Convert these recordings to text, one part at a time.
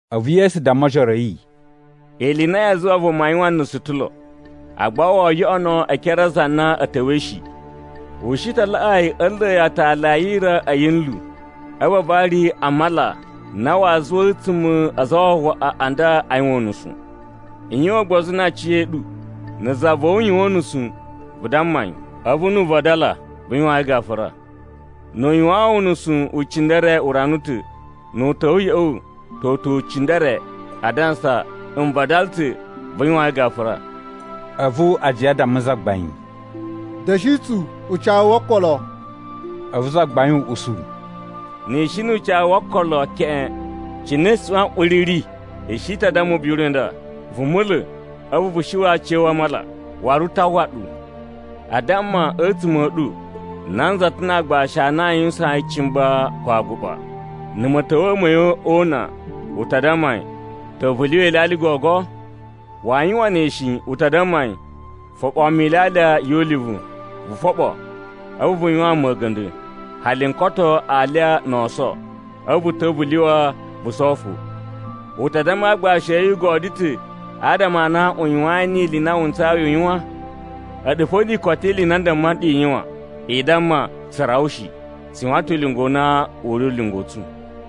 A̱vu Yesu damma ojoro a̱ yi, “Ili i na yaa zuwa vuma yuwan nusu o ta̱ lo, agba woo yoꞌono e ekere a za na a̱ ta̱wa̱i shi. U shi ta laꞌaa yi a̱ nla̱a̱ yi aatali a yira a̱ yinlu a̱vu a vari yi a mala na waa zuwa a̱tsuma̱ a aza a wawaꞌa a nda a yuwan unusu. I yuwan ugbozu na aciya̱ɗu. “Na̱ za va̱ wu yuwan unusu, vu damma yi. A̱vu nu u vadala, vu yuwaan yi gafura. Nu u yuwaan wu unusu ucindere urana u ta̱, nu u ta̱wa̱ ya̱ꞌa̱ wu toto ucindere, adansa, ‘N vadala ta̱,’ vu yuwaan yi gafura.” A̱vu ajiya a damma Zagbain, “Da̱shi tsu ucawu wo okolo!” A̱vu Zagbain u usu, “Ni i shi nu ucawu wo okolo keꞌen cine suꞌwan uri ri, i shi ta damma ubiri u nda, ‘Vu mula̱, a̱vu vu shuwa̱ aciya̱wu a mala!’ Waru u ta uwwa ɗu. “A damma, a̱tsuma̱ a̱ ɗu nanza ta̱ na aagbashi a na a yuwusaan yi cimba ko aguɓa. Na̱ ma̱ta̱wa̱a̱ ma̱ yi o una, u ta damma yi, ‘Ta̱wa̱ vu lyuwa ilyalya gogo?’ Waa yuwan ne shi. U ta damma yi, ‘Foɓoo mu ilyalya yu ulivu, vu foɓo, a̱vu vu yuwaan mu a̱ga̱nda̱, hali n koto alya no oso. A̱vu vu ta̱wa̱ vu lyuwa vu sowo fo.’ U ta damma aagbashi a̱ yi u godyo ta̱ adama a na u yuwain ili i na wu ntsayi u yuwan? A̱ɗu fo ni i koto ili i na a damma nɗu i yuwan, i damma, ‘Tsu rawa shi. Tsu yuwan ta̱ ulinga u na u ri ulinga u tsu.’”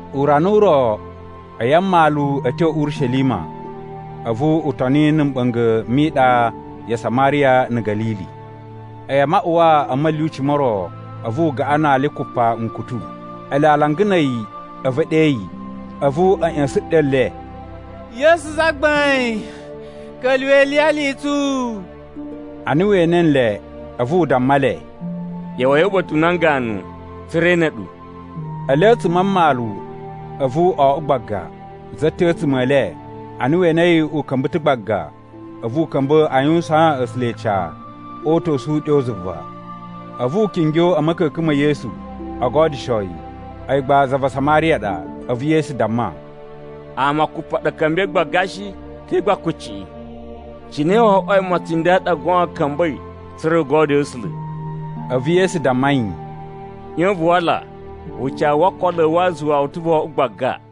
Urana u ro, a̱yi a mmalu a̱ tyo Urishelima, a̱vu u toni na̱ mɓa̱nga̱ mi iɗa ya Samariya na̱ Ga̱lili. A̱yi a maꞌuwaa a̱ ma̱lyuci mo ro, a̱vu u gaꞌan na ali kupa nkutu. Ele alanga na̱ a̱yi, a̱vu e ɗe yi. A̱vu a̱ ꞌya̱sa̱n ɗyo le, “Yesu Zagbain, ka̱lyuwa̱ iliyali i tsu.” Ana we ene nle, a̱vu u damma le, “ꞌYa̱wa̱i uba̱ta̱ u nan ganu, tsa̱ra̱ e ene ɗu.” Ele a̱tsuma̱ a mmalu, a̱vu o oꞌwo gbaga. Za ta̱ a̱tsuma̱ e le, ana we enei u ka̱mba̱ ta̱ gbaga, a̱vu u ka̱mba̱ a yuwusaan A̱sula̱ ica o uta̱su uɗyo zuva. A̱vu u kingyo a̱ ma̱ka̱ka̱n ma̱ Yesu o godyusho yi. A̱yi gba za va Samariya ɗa. A̱vu Yesu damma, “Ama kupa ɗa a̱ ka̱mba̱i gbaga shi? Te gba kucciꞌi? Cine wo oꞌwoi mocin nda ɗa goon ka̱mba̱i tsa̱ra̱ u godyoo A̱sula̱?” A̱vu Yesu damma yi, “ꞌYon vu wala. Ucawu wo okolo a̱ wu a zuwa wu ta̱ vo oꞌwo gbaga.”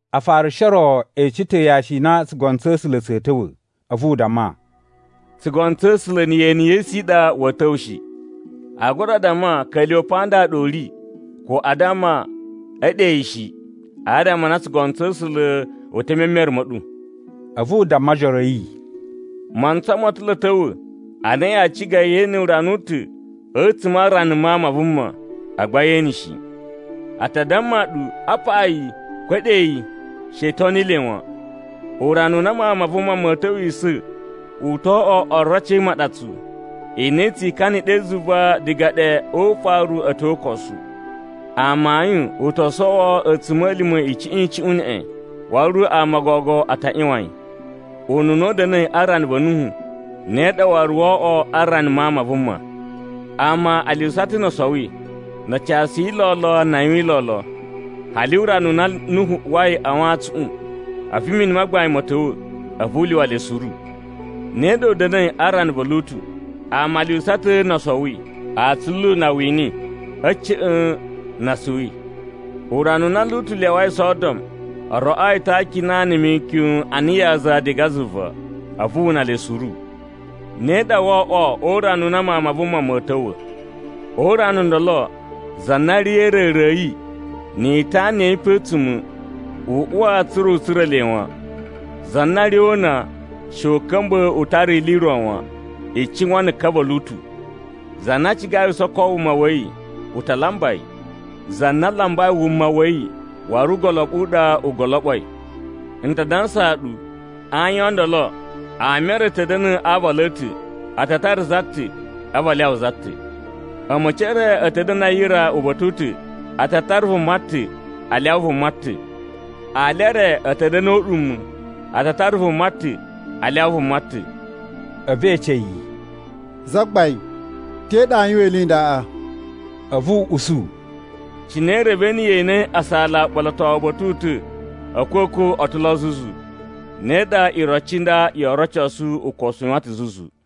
Afarishi o ro e ece ta̱ yashi i na tsugono tsa̱ A̱sula̱ tsa̱a̱ ta̱wa̱. A̱vu u damma, “Tsugono tsa̱ A̱sula̱ na̱ yeni ye esu i ɗa wa̱a̱ ta̱wa̱ shi. Aa gura damma, ‘Ka̱lyuwa̱ pa nda ɗa u ri!’ ko aa damma, ‘A̱ ɗe yi!’ shi. Adama a na tsugono tsa̱ A̱sula̱ u te e memere ma̱ ɗu.” A̱vu u damma ojoro a̱ yi, “Mantsa ma̱ ta̱ lo a̱ ta̱wa̱ ana yaa ciga yee ene urana u ta̱ a̱tsuma̱ a rana Mawun ma Vuma, agba yee ene shi. A ta damma ɗu, ‘Apa yi!’ ko ‘A̱ ɗe yi!’ She i toni le wan. Urana u na Mawun ma Vuma ma̱a̱ ta̱wisa̱ u to oꞌwo oroci e imaɗatsu, i na i tsi ikana ɗe zuva diga ɗe o ufaru a̱ tyo o ukosu. Amayun u to sowo a̱tsuma̱lima̱ icuꞌun icuꞌun neꞌen, waru ama o gogo a ta ꞌyuwan yi. “Ununa u da̱na̱i a rana va̱ Nuhu, ne ɗa waru woo oꞌwo a rana Mawun ma Vuma. Ama a lyuwusa ta̱ no o sowi, na a casuyi lolo na a yuwin lolo, hali urana u na Nuhu uwai a wantsuꞌun. A̱vu mini ma gbain ma̱ ta̱wa̱, a̱vu u lyuwa le suru. “Ne ɗa u da̱na̱i a rana va̱ Lutu. Ama a lyuwusa ta̱ no o sowi, a atsulu na a wini, a̱ ca̱ꞌa̱n na a suwi. Urana u na Lutu lyawai Sodom, o roꞌoo yi ta̱ akina na̱ mikyon ana yaza diga zuva, a̱vu wu una le suru. “Ne ɗa woo oꞌwo urana u na Mawun ma Vuma ma̱a̱ ta̱wa̱. O urana u ndolo, za na ri a̱ a̱ra̱ra̱ a̱ yi, ni itana ya̱ yi pe a̱tsuma̱, u uwa tsa̱ra̱ u tsura̱ le wan. Za na ri o una, she u ka̱mba̱ u tara ili i ro wan. I cuwan na̱ ka va̱ Lutu! Za na cigai u soko wuma wa̱ yi, u ta lamba yi. Za na lambai wuma wa̱ yi waru ugoloɓu u ɗa u goloɓoi. N ta dansaa ɗu, a ayin o ndolo, ama e re a̱ ta̱ da̱na̱ a aavalu a̱ ta̱, a ta tara za ta̱, a̱vu a lyawa za ta̱. A̱ma̱ci e re a̱ ta̱ da̱na̱ a yira uba̱ta̱ u ta̱; a ta tara vuma ta̱, a lyawa vuma ta̱. [ Ali e re a̱ ta̱ da̱na̱ o uɗuma̱, a ta tara vuma ta̱, a lyawa vuma ta̱.]” A̱vu e ece yi, “Zagbain, te ɗa aa yuwan ili i ndaꞌa?” A̱vu u usu, “Cine i revei na̱ ye ene asala uɓolotowu uba̱ta̱ u ta̱ a̱a̱kwa̱kwa̱ o ta̱ lo zuzu, ne ɗa iroci i nda yoo rocosu ukosu u yuwan ta̱ zuzu.”